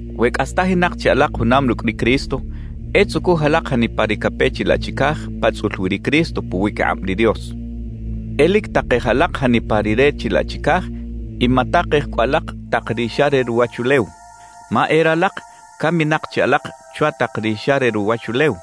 We cꞌastajinak chi alak junam rucꞌ ri Cristo, e tzucuj alak janipa ri cape chilaꞌ chicaj pa tzꞌul wi ri Cristo puwiquikꞌab ri Dios. E lic takej alak janipa ri re chilaꞌ chicaj y matakej cꞌu alak tak ri xa re ruwachulew. Ma e ralak caminak chi alak chwa tak ri xa re ruwachulew;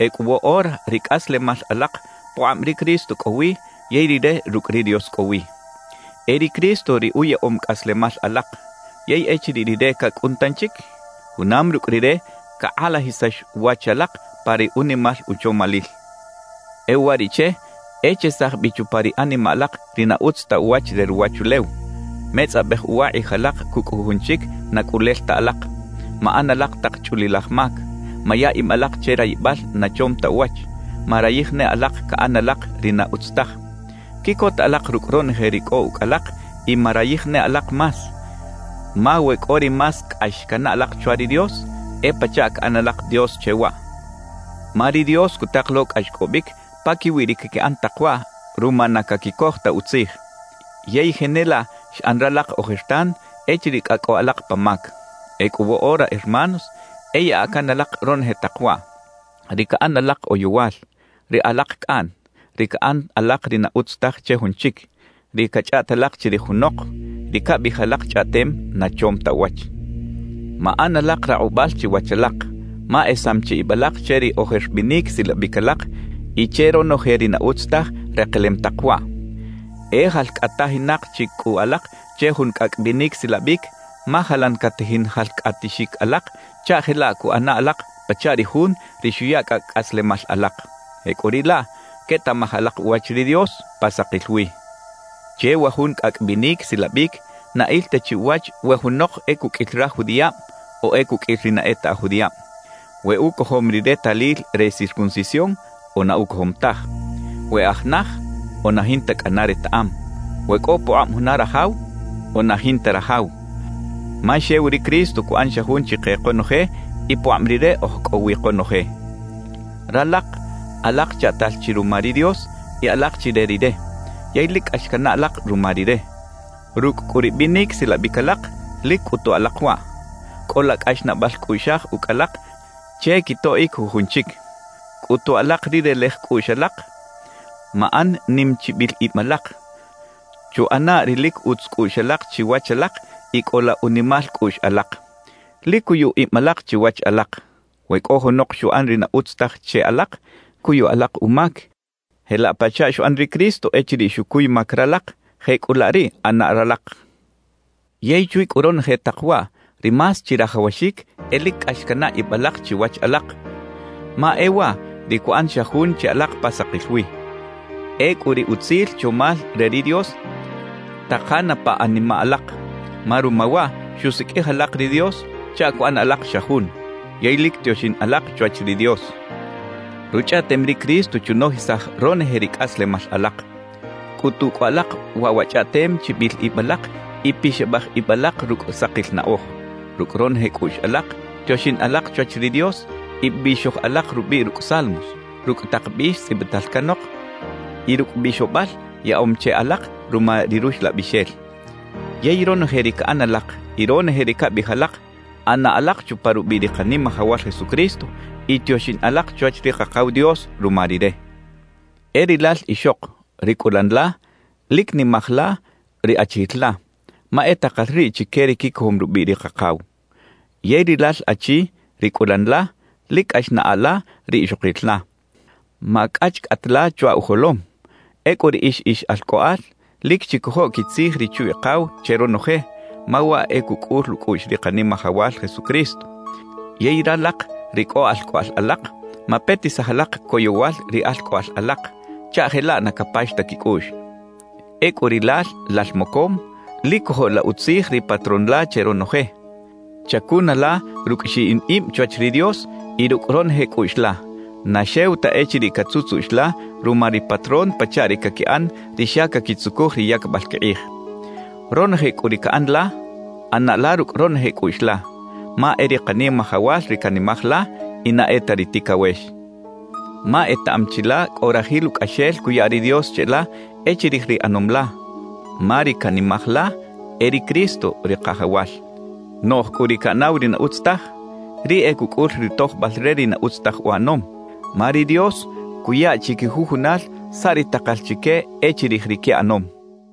ecꞌu woꞌora ri cꞌaslemal alak pukꞌab ri Cristo cꞌo wi yey Rire rucꞌ ri Dios cꞌo wi. E ri Cristo ri uyaꞌom cꞌaslemal alak. Yey echiriꞌ Rire cacꞌun tanchic, junam rucꞌ Rire cakꞌalajisax wach alak pa ri unimal uchomalil. E uwariꞌche, e chesaj bi chupa ri animaꞌ alak ri na utz ta uwach re ruwachulew: metzꞌabej uwa kꞌij alak cucꞌ jujun chic na cꞌulel ta alak, maꞌan alak tak chꞌulilaj mac, maya ib alak che rayibal na chom ta uwach, marayij ne alak caꞌan alak ri na utz taj. Quiꞌcota alak rucꞌ ronoje ri cꞌo ucꞌ alak y marayij ne alak más; ma we cꞌo ri más cꞌax canaꞌ alak chwa ri Dios, e pachaꞌ caꞌan alak dios che waꞌ. Ma ri Dios cutak lo cꞌaxcꞌobic paquiwi ri caquiꞌan tak waꞌ ruma na caquicoj ta utzij. Yey jenelaꞌ xꞌan ralak ojertan echiriꞌ cꞌa cꞌo alak pa mac. Ecꞌu woꞌora hermanos e yaꞌa can alak ronoje tak waꞌ: ri caꞌan alak oyowal, ri alak cꞌaꞌn, ri caꞌan alak ri na utz taj che jun chic, ri cachꞌaꞌt alak chirij junok, ri cabiꞌij alak chꞌaꞌtem na chom ta uwach. Maꞌan alak rakꞌubal chiwach alak, ma esam chi ib alak che ri ojer binic silabic alak y che ronoje ri na utz taj rekelem tak waꞌ. E jalcꞌatajinak chi cꞌu alak che jun cꞌacꞌ binic silabic, ma jalan catajin jalcꞌatixic alak chaꞌ jelaꞌ cuꞌana alak pachaꞌ ri Jun ri xuya cꞌacꞌ cꞌaslemal alak. Jecꞌuriꞌlaꞌ quetaꞌmaj alak uwach ri Dios pa sakil wi. Che wa jun cꞌacꞌ binic silabic na il ta chi uwach we junok e cuqꞌuil raj judiꞌab o e cuqꞌuil ri na e ta aj judiꞌab, we ucojom ri retalil re circuncisión o na ucojom taj, we aj naj o na jinta cꞌana retaꞌam, we cꞌo pukꞌab juna rajaw o na jinta rajaw; ma xew ri Cristo cuꞌan xa jun chike konoje y pukꞌab Rire oj cꞌo wi konoje. Ralak alak chaꞌtal chi ruma ri Dios y alak chi re Rire, yey lic cꞌax canaꞌ alak ruma Rire. Rucꞌ cꞌu ri binic silabic alak, lic cꞌutu alak waꞌ: Cꞌola cꞌaxnaꞌbal cꞌuꞌxaj ucꞌ alak che quitoꞌic jujun chic, cꞌutu alak ri relej cꞌuꞌx alak, maꞌan nim chibil ib alak, chuꞌana ri lic utz cꞌuꞌx alak chiwach alak y cꞌola unimal cꞌuꞌx alak. Lic cuyu ib alak chiwach alak. We cꞌo junok xuꞌan ri na utz taj che alak, cuyu alak umac. Jelaꞌ pachaꞌ xuꞌan ri Cristo echiriꞌ xucuy mac ralak, jecꞌulaꞌ riꞌ ꞌana ralak. Yey chwi cꞌu ronoje tak waꞌ, ri más chirajawaxic e lic cꞌax canaꞌ ib alak chiwach alak, ma e waꞌ ri cuꞌan xa jun che alak pa sakil wi. Ecꞌu ri utzil chomal re ri Dios takana pa animaꞌ alak, ma ruma waꞌ xusiqꞌuij alak ri Dios chaꞌ cuꞌan alak xa jun. Yey lic tioxin alak chwach ri Dios. Ruchꞌaꞌtem ri Cristo chunojisaj ronoje ri cꞌaslemal alak. Cꞌutu cꞌu alak waꞌ wa chꞌaꞌtem chibil ib alak y pixabaj ib alak rucꞌ sakil naꞌoj. Rucꞌ ronoje cꞌuꞌx alak tioxin alak chwach ri Dios y bixoj alak rubiꞌ rucꞌ salmos, rucꞌ tak bix tzꞌibital canok y rucꞌ bixobal yaꞌom che alak ruma ri Ruxlabixel. Yey ronoje ri caꞌan alak y ronoje ri cabiꞌij alak, ꞌana alak chupa rubiꞌ ri Kanimajawal Jesucristo y tioxin alak chwach ri Kakaw Dios ruma Rire. E rilal ixok, ri cꞌulan la, lic nimaj la ri achijil la, ma e takal riꞌ chique ri quicojom rubiꞌ ri Kakaw. Yey rilal achi, ri cꞌulan la, lic cꞌax naꞌa la ri ixokil la. Macꞌachcꞌat la chwa ujolom. Ecꞌu riꞌix ix alcꞌoꞌal, lic chicojo quitzij richu-ikaw che ronoje, ma waꞌ e cucꞌul ucꞌuꞌx ri Kanimajawal Jesucristo. Yey ralak ri cꞌo alcꞌoꞌal alak, mapetisaj alak coyowal ri alcꞌoꞌal alak, chaꞌ jelaꞌ na capax ta quicꞌuꞌx. Ecꞌu rilal lal mocom, lic cojo la utzij ri patrón la che ronoje. Chacuna la rucꞌ xiꞌin ib chwach ri Dios y rucꞌ ronoje cꞌuꞌx la, na xew ta echiriꞌ catzutzuꞌx la ruma ri patrón pachaꞌ ri caquiꞌan ri xa caquitzucuj ri yacbal quikꞌij. Ronoje cꞌu ri caꞌan la, ꞌana la rucꞌ ronoje cꞌuꞌx la, ma e ri Kanimajawal ri canimaj la y na e ta ri ticawex. Ma etaꞌam chi la cꞌo rajil ucꞌaxel cuya ri Dios cheꞌla e chirij ri ꞌanom la, ma ri canimaj la e ri Cristo ri Kajawal. Noꞌj cꞌu ri caꞌanaw ri na utz taj, riꞌ e cucꞌul ri tojbal re ri na utz taj uꞌanom, ma ri Dios cuya chiquijujunal saꞌ ri takal chique e chirij ri quiꞌanom.